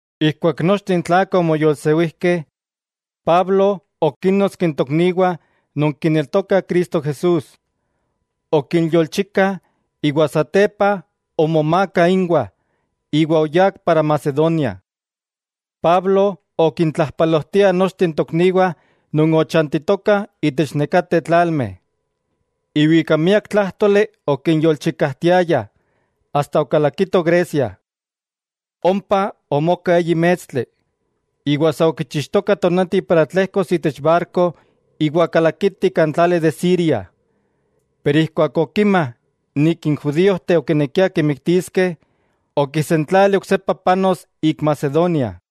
Ijkuak nochteh n tlakah omoyolsewijkeh, Pablo okínnotski n tokniwah non kineltokah Cristo Jesús. Okinyolchika iwa satepa omomaaka inwah iwa oyá Macedonia. Pablo okintlajpalojtia nochteh n tokniwah non ochantitokah itech nekateh tlalmeh, iwa ika miak tlájtoli okinyolchikajtiaya asta okalakito Grecia. Ompa omoka eyi mestli, iwa sa okichixtoka tonati para tlejkos itech barko iwa kalakiti kan tlali de Siria, keman okima n judíojteh okinekiah kimiktiskeh, okisentlali oksepa panos ik Macedonia.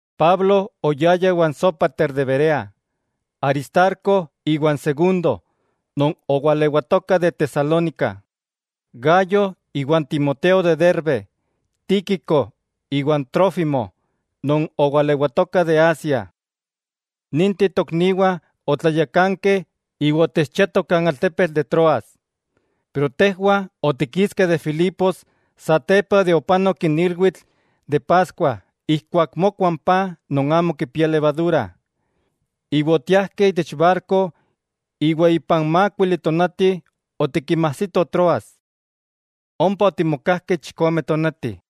Pablo oyaya iwan Sópater de Berea, Aristarco iwa n Segundo non owalewatokah de Tesalónica, Gayo iwa n Timoteo de Derbe, Tíquico iwa n Trófimo non owalewatokah de Asia. Ninteh tokniwah otlayakankeh iwa otechchiatoh kan altepetl de Troas. Pero tejwah otikiskeh de Filipos satepa de opanok n ilwitl de Paskua ijkuak mokua n paj non amo kipia levadura, iwa otiajkeh itech barko iwa ipan mákuili tonati otikinmajsitoh Troas. Ompa otimokajkeh chikome tonati.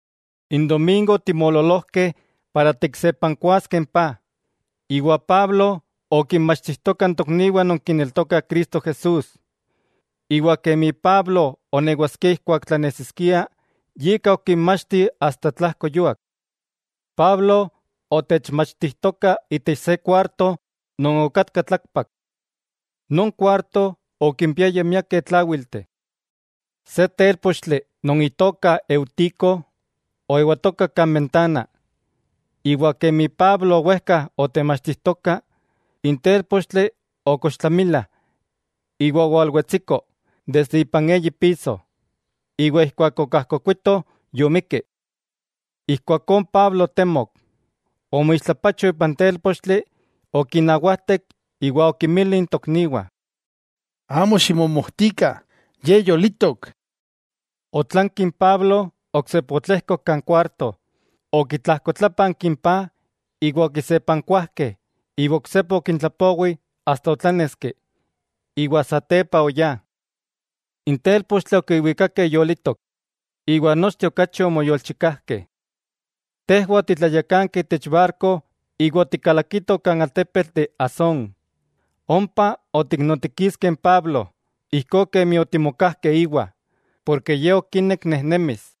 N domingo otimoololojkeh para tiksepankuaskeh n paj, iwa Pablo okinmachtijtoka n tokniwah non kineltokah Cristo Jesús. Iwa kemi Pablo onewaskia ijkuak tlanesiskia, yika okinmachti asta tlajko yuak. Pablo otechmachtijtoka itech se kuarto non okatka tlakpak. Non kuarto okimpiaya miakeh tláwilteh. Se télpochtli non itoka Eutico oewatoka kan bentana. Iwa kemi Pablo owejka otemachtijtoka, n télpochtli okochtlamila iwa owalwetsiko desde ipan eyi piso, iwa ijkuak okajkokuitoh yomikki. Ijkuakó n Pablo otemok, omoixtlapacho ipan télpochtli okinawajtek iwa okinmili n tokniwah: —Amo ximomojtikah, ye yolitok. Otlanki n Pablo oksepa otlejkok kan kuarto, okitlajkotlápanki n paj, iwa okisepankuajkeh iwa oksepa okintlapowi asta otláneski. Iwa satepa oyá. N télpochtli okiwikakeh yolitok, iwa nochteh okachi omoyolchikajkeh. Tejwah otitlayakankeh itech barko iwa otikalakitoh kan altepetl de Asón, ompa otiknotikiskeh n Pablo, ijkó kemi otimokajkeh íwa, porke ye okinek nejnemis.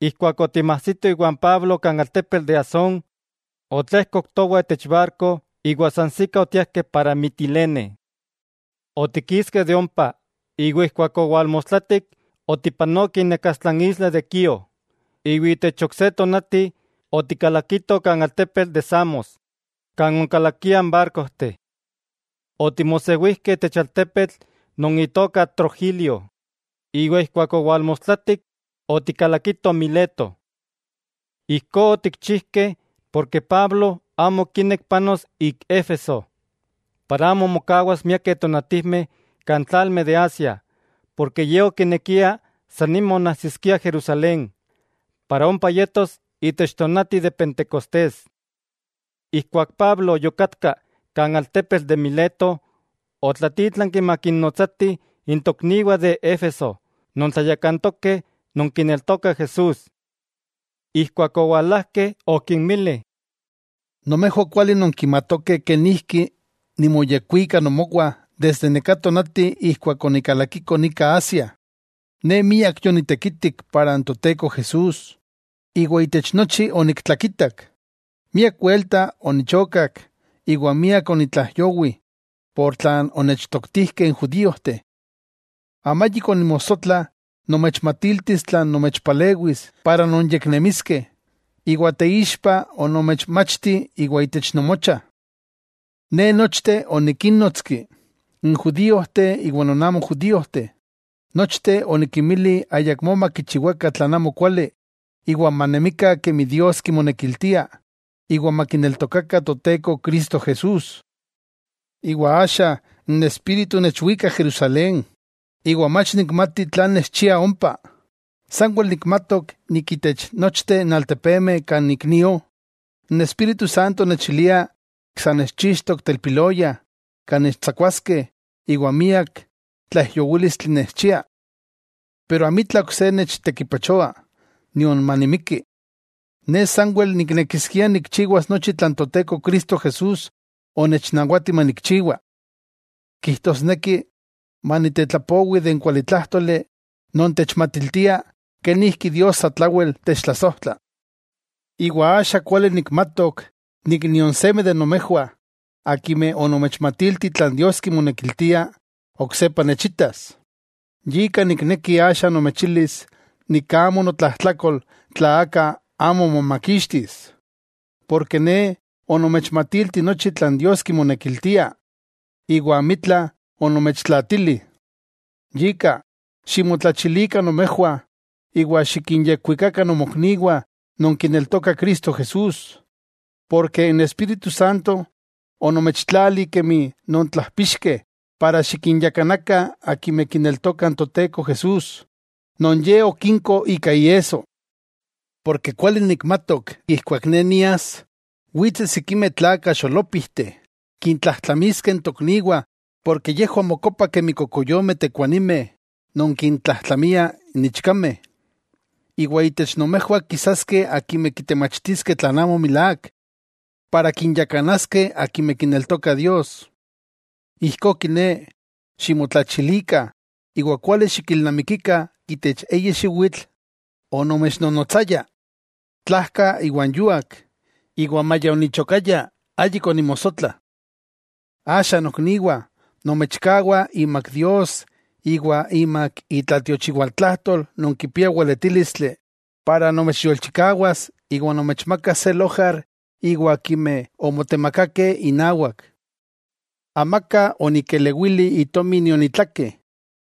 Ijkuak otimajsito iwan Pablo kan altepetl de Asón, otlejkok towah itech barko iwa sansikah otiajkeh para Mitilene. Otikiskeh de ompa, iwa ijkuak owalmostlatik otipanokeh inakastla n isla de Quío, iwa itech ok se tonati otikalakitoh kan altepetl de Samos, kan onkalakiah n barkojteh. Otimosewijkeh itech altepetl non itoka Trogilio, iwa ijkuak owalmostlatik otikalakitoh Mileto. Ijkó otikchijkeh, porke Pablo amo okinek panos ik Éfeso, para amo mokawas miakeh tonatijmeh kan tlalmeh de Asia, porke ye okinekia san nima onajsiskia Jerusalén, para ompa yetos itech tonati de pentecostés. Ijkuak Pablo yokatka kan altepetl de Mileto, otlatítlanki makinnotsatih n tokniwah de Éfeso non tlayakantokeh non kineltokah Jesús. Ijkuak owalajkeh okinmili: —Nomejwah kuali nonkimatokeh kenijki nimoyekwika nomowah desde neká tonati ijkuak onikalakiko nika Asia. Ne miak yonitekitik inawak Toteko Jesús, iwa itech nochi oniktlakitak. Miak welta onichokak iwa miak onitlaijyowi por tlan onechtoktijkeh n judíojteh. Amayik onimosotla nomechmatiltis tlan nomechpalewis para nonyeknemiskeh. Iwa teixpa onomechmachti iwa itech nomocha. Ne nochteh onikinnonotski, n judíojteh iwa non amo judíojteh, nochteh onikinmili ayakmó makichiwakah tlan amo kuali iwa manemikah kemi Dios kimonekiltia iwa makineltokakah Toteko Cristo Jesús. Iwa axa n Espíritu nechwika Jerusalén, iwa mach nikmati tlan nechchia ompa. Sanwel nikmatok itech nochteh n altepemeh kan ik nio, n Espíritu Santo nechilia sa nechchixtok telpiloya kan nechtsakuaskeh iwa miak tlaijyowílistli nechchiah. Pero amitla ok se nechtekipachoa, nion manimikki. Ne sanwel niknekiskia nikchiwas nochi tlan Toteko Cristo Jesús onechnawati manikchiwa. Kijtosneki manitetlapowi de n kualitlájtoli non techmatiltia kenijki Dios satlawel techtlasojtla. 'Iwa axa kuali nikmatok nion seme de nomejwah, akimeh onomechmatilti tlan Dios kimonekiltia, oksepa nechitas. Yika nikneki axa nomechilis nik amo notlajtlakol tla aka amo momakixtis. Porke ne onomechmatilti nochi tlan Dios kimonekiltia, iwa amitla onomechtlaatili. Yika, ximotlachilikah nomejwah iwa xikinyekwikakah nomokniwah non kineltokah Cristo Jesús, porke n Espíritu Santo onomechtlali kemi nontlajpixkeh para xikinyakanakah akimeh kineltokah n Toteko Jesús, non Ye okinko ika iesso. Porke kuali nikmatok ijkuak ne nias, witseh sikimeh tlakah xolópijteh kintlajtlamiskeh n tokniwah porke yejwah mokopah kemi kokoyomeh tekuanimeh non kintlajtlamiah n ichkameh. Iwa itech nomejwah kisaskeh akimeh kitemachtiskeh tlan amo milák, para kinyakanaskeh akimeh kineltoka Dios. Ijkó kiné, ximotlachilikah, iwa kuali xikilnamikikah itech eyi xiwitl onomechnonotsaya, tlajka iwa n yuak, iwa maya onichokaya ayik onimosotla. 'Axa nokniwah, nomechkawa imak Dios iwa imak itlatiochiwaltlajtol non kipia weletílistli para nomechyolchikawas iwa nomechmakas se lojar iwa akimeh omotemakakeh inawak. Amaka onikelewili itomi nion itlake,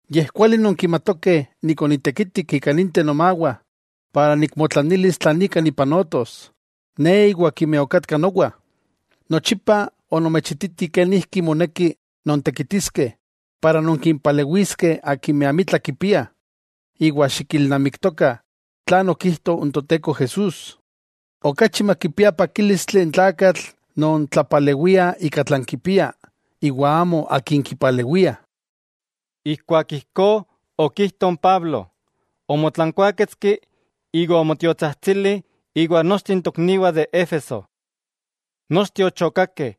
yej kuali nonkimatokeh onitekitik ika ninteh nomawah para nikmotlanilis tlan ika nipanotos, ne iwa akimeh okatkah nowa. Nochipa onomechititi kenijki moneki nontekitiskeh para nonkimpalewiskeh akimeh amitla kipiah, iwa xikilnamiktokah tlan okijto n Toteko Jesús: “Okachi makipia pakílistli n tlakatl non tlapalewia ika tlan kipia, iwa amo akin kipalewiah.” Ijkuak ijkó okijto n Pablo, omotlankuáketski iwa omotiotsajtsili iwan nochteh tokniwah de Éfeso. Nochteh ochokakeh,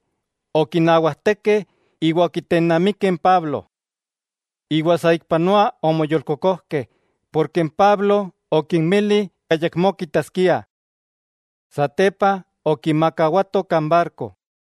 okinawajtekeh iwa okitennamikeh n Pablo. Iwa saikpanoa omoyolkokojkeh porke n Pablo okinmili ayakmó kitaskiah. Satepa okimakawatoh kan barko.